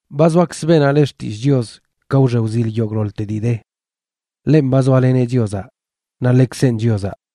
Ba zoakzə beenaꞌ le Xtillꞌ Chios ka wxe wzil yogꞌḻoḻte dii de. Ḻenꞌ ba zoaleneꞌ Chiozaꞌ, naꞌ ḻekzenꞌ Chiozaꞌ,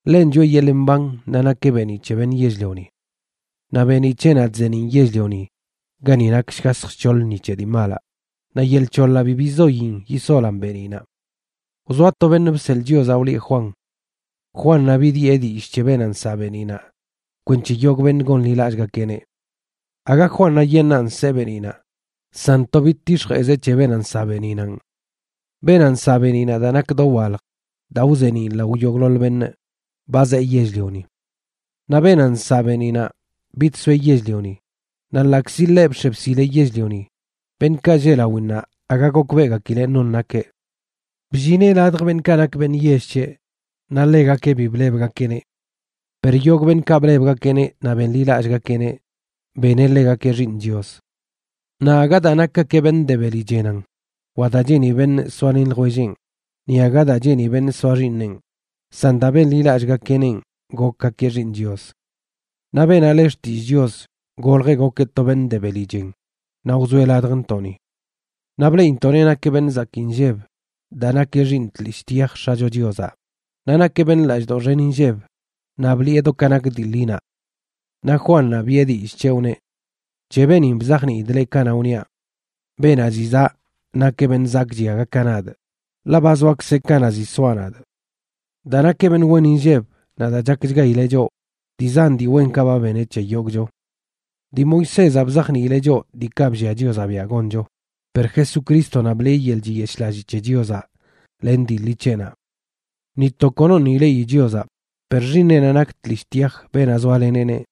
Ḻenꞌ choꞌe yeḻꞌ mban, naꞌ nakeꞌ beeniꞌ c̱he beṉꞌ yell-lioni. Naꞌ beeniꞌ c̱heꞌnaꞌ chzeeniꞌn yell-lioni gani nak shgasj shc̱hoḻ ni c̱he dii malaꞌ, naꞌ yel c̱hoḻaꞌ bi bizoyin yisolan beeniꞌnaꞌ. Wzoa to beṉꞌ bseḻꞌ Chiozaꞌ wlieꞌ Juan. Juannaꞌ bidyee dillꞌ c̱he beenaꞌ nsaꞌ beeniꞌnaꞌ kwenc̱he yogꞌ beṉꞌ gonḻilallꞌgakeꞌneꞌ. Aga Juannaꞌyeṉꞌnan nsee beeniꞌnaꞌ, san to bidtix̱jeꞌzeꞌ c̱he beenaꞌ nsaꞌ beeniꞌnanꞌ. Beenaꞌ nsaꞌ beeniꞌnaꞌ daa nak dowalj daa wzeeniꞌn lao yogꞌḻoḻ beṉꞌ, ba zee yell-lioni. Naꞌ beenaꞌ nsaꞌ beeniꞌnaꞌ bidsoeꞌ yell-lioni, naꞌ ḻaꞌkzi ḻeꞌ bx̱e bsileꞌ yell-lioni, beṉꞌkaꞌ lleꞌ lawinnaꞌ aga gokbeꞌgakileꞌ non nakeꞌ. Bllineꞌ ladj beṉꞌkaꞌ nak beṉꞌ yell c̱heꞌ, naꞌ ḻegakeꞌ bi blebgakeꞌneꞌ. Per yogꞌ beṉꞌkaꞌ blebgakeꞌneꞌ naꞌ benḻilallꞌgakeꞌneꞌ, beneꞌ ḻegakeꞌ xiiṉ Chios. Naꞌ aga daa nakgakeꞌ beṉꞌ de beli chenan, wa daa cheeni beṉꞌ soalen ljwellenꞌ, ni aga daa cheeni beṉꞌ soa xiiṉenꞌ, san daa benḻilallꞌgakeꞌnenꞌ gokgakeꞌ xiiṉꞌ Chios. Naꞌ beenaꞌ le Xtillꞌ Chios goljeꞌ gokeꞌ to beṉꞌ de beli chen naꞌ wzoeꞌ ladjntoꞌni. Naꞌ bleꞌintoꞌneꞌ nakeꞌ beṉꞌ zakii nlleb daa nakeꞌ Xiiṉ tlishꞌ tyaj X̱acho Chiozaꞌ, naꞌ nakeꞌ beṉꞌ lallꞌdoꞌ xen inlleb naꞌ bliꞌe do ka nak dii ḻinaꞌ. Naꞌ Juannaꞌ biꞌe dillꞌ c̱heꞌ wneꞌ: ―C̱he beenin bzajniidꞌ leꞌ kanaꞌ wniaꞌ: “Beenaꞌ ziꞌ zaꞌ nakeꞌ beṉꞌ zakꞌchi aga ka nadꞌ, ḻaꞌ ba zoakzeꞌ kanaꞌ ziꞌ soaꞌ nadꞌ.” Daa nakeꞌ beṉꞌ wen inlleb naꞌ daa chakchgaileꞌ choꞌ, dii zan dii wenkaꞌ ba beneꞌ c̱he yogꞌcho. Dii Moisézaꞌ bzajniileꞌ choꞌ diikaꞌ bllia Chiozaꞌ biaꞌ goncho; per Jesucrístonaꞌ bliꞌe yeḻꞌ chiyeshꞌlalli c̱he Chiozaꞌ len dii ḻi c̱heꞌnaꞌ. Ni to konoṉꞌ ileꞌi Chiozaꞌ, per Xiiṉeꞌnaꞌ nak tlishꞌ tyaj, beenaꞌ zoaleneꞌneꞌ,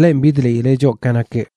ḻenꞌ bidliileꞌ choꞌ ka nakeꞌ.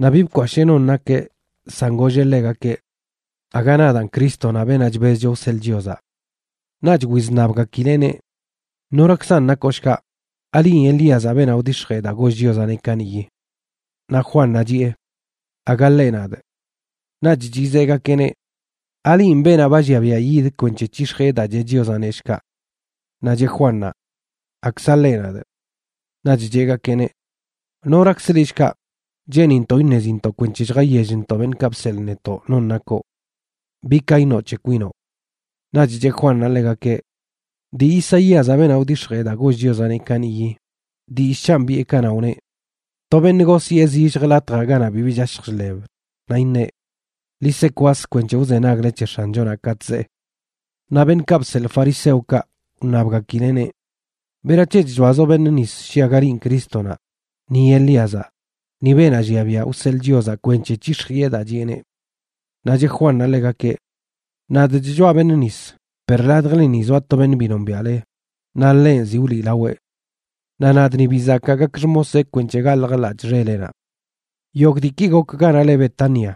Naꞌ bi bkwashee non nakeꞌ, san golleꞌ ḻegakeꞌ: ―Aga nadaan Crístonaꞌ, beenaꞌ chbezcho wseḻꞌ Chiozaꞌ. Naꞌch wizṉabgakileꞌneꞌ: ―¿Norakzan nakoꞌ shkaꞌ? ¿Alinꞌ Elíazaꞌ, beenaꞌ wdix̱jee daa goll Chiozaꞌneꞌ kaniꞌyi? Naꞌ Juannaꞌ chiꞌe: ―Aga ḻeꞌ nadꞌ. Naꞌch chizeꞌgakeꞌneꞌ: ―¿Alinꞌ beenaꞌ ba llia biaꞌ yid kwenc̱he c̱hix̱jiꞌe daa cheꞌ Chiozaꞌneꞌ, shkaꞌ? Naꞌ cheꞌ Juannaꞌ: ―Akza ḻeꞌ nadꞌ. Naꞌch cheꞌgakeꞌneꞌ: ―¿Norakzə liꞌ, shkaꞌ? Cheenintoꞌ iṉezintoꞌ kwenc̱he lljayellntoꞌ beṉꞌkaꞌ bseḻꞌ netoꞌ non nakoꞌ. ¿Bi ka iṉoꞌ c̱he kwinoꞌ? Naꞌch cheꞌ Juannaꞌ ḻegakeꞌ: ―Dii Isaíazaꞌ, beenaꞌ wdix̱jee daa goll Chiozaꞌneꞌ kaniꞌyi, dillꞌ c̱hanꞌ biꞌe kanaꞌ wneꞌ: “To beṉꞌ gosyee zillj latjaꞌ ganaꞌ bibi chashj chḻeb, naꞌ iṉeꞌ: Ḻi se kwas kwenc̱he wzenagle c̱he X̱anchonaꞌ katꞌ zee.” Naꞌ beṉꞌkaꞌ bseḻꞌ fariseokaꞌ wṉabgakileꞌneꞌ: ―¿Berac̱he chchoazoꞌ beṉꞌ nis shi aga linꞌ Crístonaꞌ, ni Elíazaꞌ, ni beenaꞌ llia biaꞌ wseḻꞌ Chiozaꞌ kwenc̱he c̱hix̱jiꞌe daa chiꞌeneꞌ? Naꞌ cheꞌ Juannaꞌ ḻegakeꞌ: ―Nadꞌ chchoaꞌ beṉꞌ nis, per ladjleni zoa to beṉꞌ bi nombiaꞌle, naꞌ ḻenꞌ ziꞌ wliꞌlaweꞌ. Naꞌ nadꞌ ni bi zakaa gakꞌ xmoseꞌ kwenc̱he galjꞌ ḻaꞌc̱hꞌ xeleꞌnaꞌ. Yogꞌ diiki gok ganaꞌ le Betania,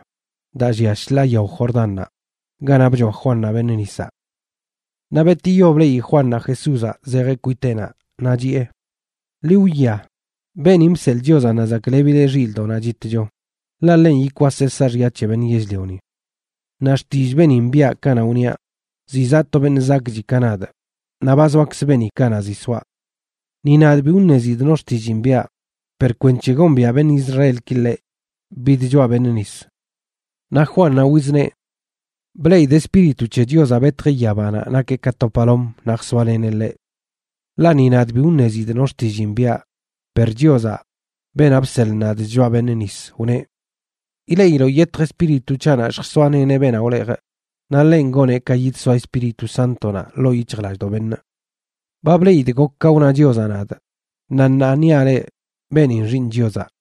daa llia shḻaa yao Jordannaꞌ, ganaꞌ bchoa Juannaꞌ beṉꞌ nisaꞌ. Naꞌ betiyo bleꞌi Juannaꞌ Jesúzaꞌ zejeꞌ kwiteꞌnaꞌ, naꞌ chiꞌe: ―Ḻi wwia, beenin bseḻꞌ Chiozaꞌ naꞌ zaklebileꞌ xilꞌdoꞌnaꞌ chitcho, ḻaꞌ ḻenꞌ yikwaseꞌ saaxya c̱he beṉꞌ yell-lioni. Naꞌ xtillꞌ beenin biꞌa kanaꞌ wniaꞌ: “Ziꞌ zaꞌ to beṉꞌ zakꞌchi ka nadꞌ, naꞌ ba zoakz beeni kanaꞌ ziꞌ soaꞌ.” Ni nadꞌ bi wṉezidꞌ no xtilliin biꞌa, per kwenc̱he gombiaꞌ beṉꞌ Israelki ḻeꞌ, bidchoaꞌ beṉꞌ nis. Naꞌ Juannaꞌ wizneꞌ: ―Bleꞌidꞌ Espíritu c̱he Chiozaꞌ betjeꞌ yabanaꞌ nakeꞌ ka to palom naꞌ jsoaleneꞌ ḻeꞌ. Ḻaꞌ ni nadꞌ bi wṉezidꞌ no xtilliin biꞌa, per Chiozaꞌ, beenaꞌ bseḻꞌ nadꞌ chchoaꞌ beṉꞌ nis, wneꞌ: “Ileꞌiloꞌ yetj Espíritu c̱haꞌnaꞌ lljsoaleneꞌ beenaꞌ wlejꞌ, naꞌ ḻenꞌ goneꞌ ka yidsoa Espíritu Sántonaꞌ ḻoo yic̱hjlallꞌdoꞌ beṉꞌ.” Ba bleꞌidꞌ gok ka wna Chiozaꞌ nadꞌ, naꞌ ṉaa niaꞌ leꞌ beenin Xiiṉ Chiozaꞌ.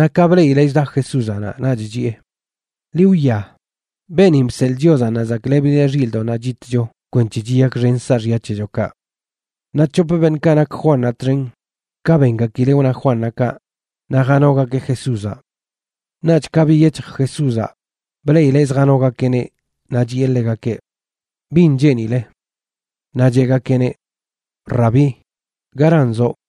Naꞌ ka bleꞌileꞌ chda Jesúzaꞌ naꞌ, naꞌch chiꞌe: ―Ḻi wwia, beenin bseḻꞌ Chiozaꞌ naꞌ zaklebileꞌ xilꞌdoꞌnaꞌ chitcho kwenc̱he chiyakxen saaxya c̱hechokaꞌ. Naꞌ c̱hop beṉꞌkaꞌ nak Juannaꞌ txen, ka bengakileꞌ wna Juannaꞌ kaꞌ, naꞌ janogakeꞌ Jesúzaꞌ. Naꞌch ka biyec̱hj Jesúzaꞌ, bleꞌileꞌ zjanogakeꞌneꞌ naꞌ chiꞌe ḻegakeꞌ: ―¿Bin cheenile? Naꞌ cheꞌgakeꞌneꞌ: ―Rabí, ¿garan zoꞌ?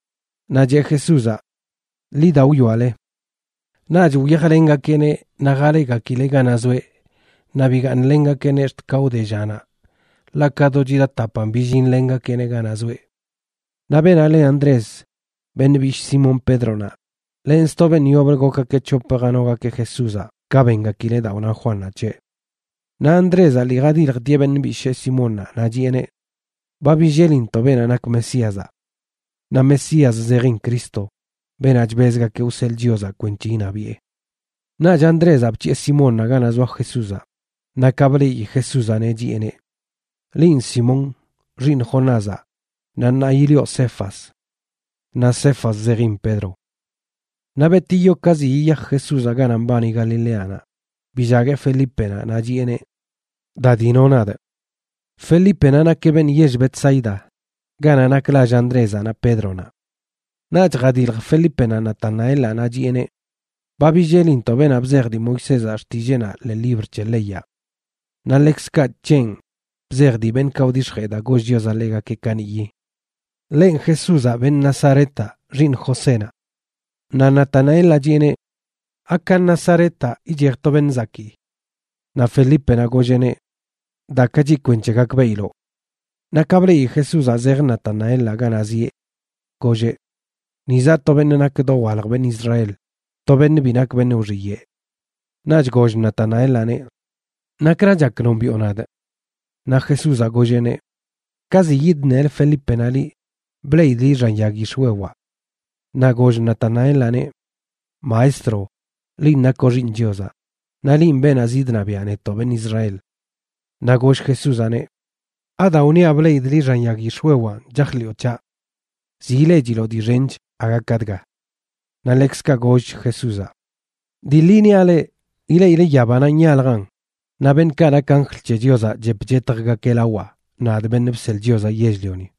Naꞌ cheꞌ Jesúzaꞌ: ―Ḻi da wwiale. Naꞌch wyajlengakeꞌneꞌ naꞌ jaleꞌgakileꞌ ganaꞌ zoeꞌ, naꞌ bigaaṉlengakeꞌneꞌ ax̱t ka wde llanaꞌ, ḻaꞌ ka do chida tapan billinlengakeꞌneꞌ ganaꞌ zoeꞌ. Naꞌ beenaꞌ le Andrés, beṉꞌ bishꞌ Simón Pédronaꞌ, len sto beṉꞌ yoblə gokgakeꞌ c̱hopə janogakeꞌ Jesúzaꞌ ka bengakileꞌ daa wna Juannaꞌ c̱heꞌ. Naꞌ Andrézaꞌ lii jadiljtieꞌ beṉꞌ bishee Simónnaꞌ, naꞌ chiꞌeneꞌ: ―Ba billelintoꞌ beenaꞌ nak Mesíazaꞌ―. Naꞌ Mesías zejin Cristo, beenaꞌ chbezgakeꞌ wseḻꞌ Chiozaꞌ kwenc̱he iṉabiꞌe. Naꞌch Andrézaꞌ bc̱hiꞌe Simónnaꞌ ganaꞌ zoa Jesúzaꞌ, naꞌ ka bleꞌi Jesúzaꞌneꞌ, chiꞌeneꞌ: ―Linꞌ Simón, xiiṉ Jonázaꞌ, naꞌ ṉaa yilioꞌ Cefas―. Naꞌ Cefas zejin Pedro. Naꞌ betiyo ka ziꞌ yiyaj Jesúzaꞌ ganaꞌ mbani Galileanaꞌ, billagueꞌ Felípenaꞌ naꞌ chiꞌeneꞌ: ―Da dino nadꞌ. Felípenaꞌ nakeꞌ beṉꞌ yell Betsaida, ganaꞌ nak lall Andrézaꞌ naꞌ Pédronaꞌ. Naꞌch jadilj Felípenaꞌ Natanaelaꞌ naꞌ chiꞌeneꞌ: ―Ba billelintoꞌ beenaꞌ bzej dii Moisézaꞌ xtilleenaꞌ ḻee libr c̱he leyaꞌ. Naꞌ ḻekzkaꞌ c̱henꞌ bzej dii beṉꞌkaꞌ wdix̱jee daa goll Chiozaꞌ ḻegakeꞌ kaniꞌyi. Ḻenꞌ Jesúzaꞌ, beṉꞌ Nazaretaꞌ, xiiṉ Josénaꞌ. Naꞌ Natanaelaꞌ chiꞌeneꞌ: ―¿Aka Nazaretaꞌ ichej to beṉꞌ zakii? Naꞌ Felípenaꞌ golleꞌneꞌ: ―Dakachi kwenc̱he gakbeꞌiloꞌ. Naꞌ ka bleꞌi Jesúzaꞌ zej Natanaelaꞌ ganaꞌ zieꞌ, golleꞌ: ―Ni zaꞌ to beṉꞌ nak dowalj beṉꞌ Israel, to beṉꞌ bi nak beṉꞌ wxiyeꞌ. Naꞌch goll Natanaelaꞌneꞌ: ―¿Nakra chak nombiꞌo nadꞌ? Naꞌ Jesúzaꞌ golleꞌneꞌ: ―Ka ziꞌ yidṉelə Felípenaꞌ liꞌ, bleꞌidꞌ liꞌ xan yag yix̱wewaꞌ. Naꞌ goll Natanaelaꞌneꞌ: ―Maestro, linꞌ nakoꞌ Xiiṉ Chiozaꞌ. Naꞌ linꞌ beenaꞌ zidṉabiaꞌ netoꞌ beṉꞌ Israel. Naꞌ goll Jesúzaꞌneꞌ: ―¿Adaa wniaꞌ bleꞌidꞌ liꞌ xan yag yix̱wewanꞌ chajḻiꞌo c̱haꞌ? Ziꞌ ileꞌchiloꞌ dii xench aga ka dga. Naꞌ ḻekzkaꞌ gollch Jesúzaꞌ: ―Dii ḻi niaꞌ leꞌ, ileꞌile yabanaꞌ nyaljan, naꞌ beṉꞌkaꞌ nak anjl c̱he Chiozaꞌ chep chetjgakeꞌ lawaꞌ, nadꞌ, Beṉꞌ Bseḻꞌ Chiozaꞌ Yell-lioni.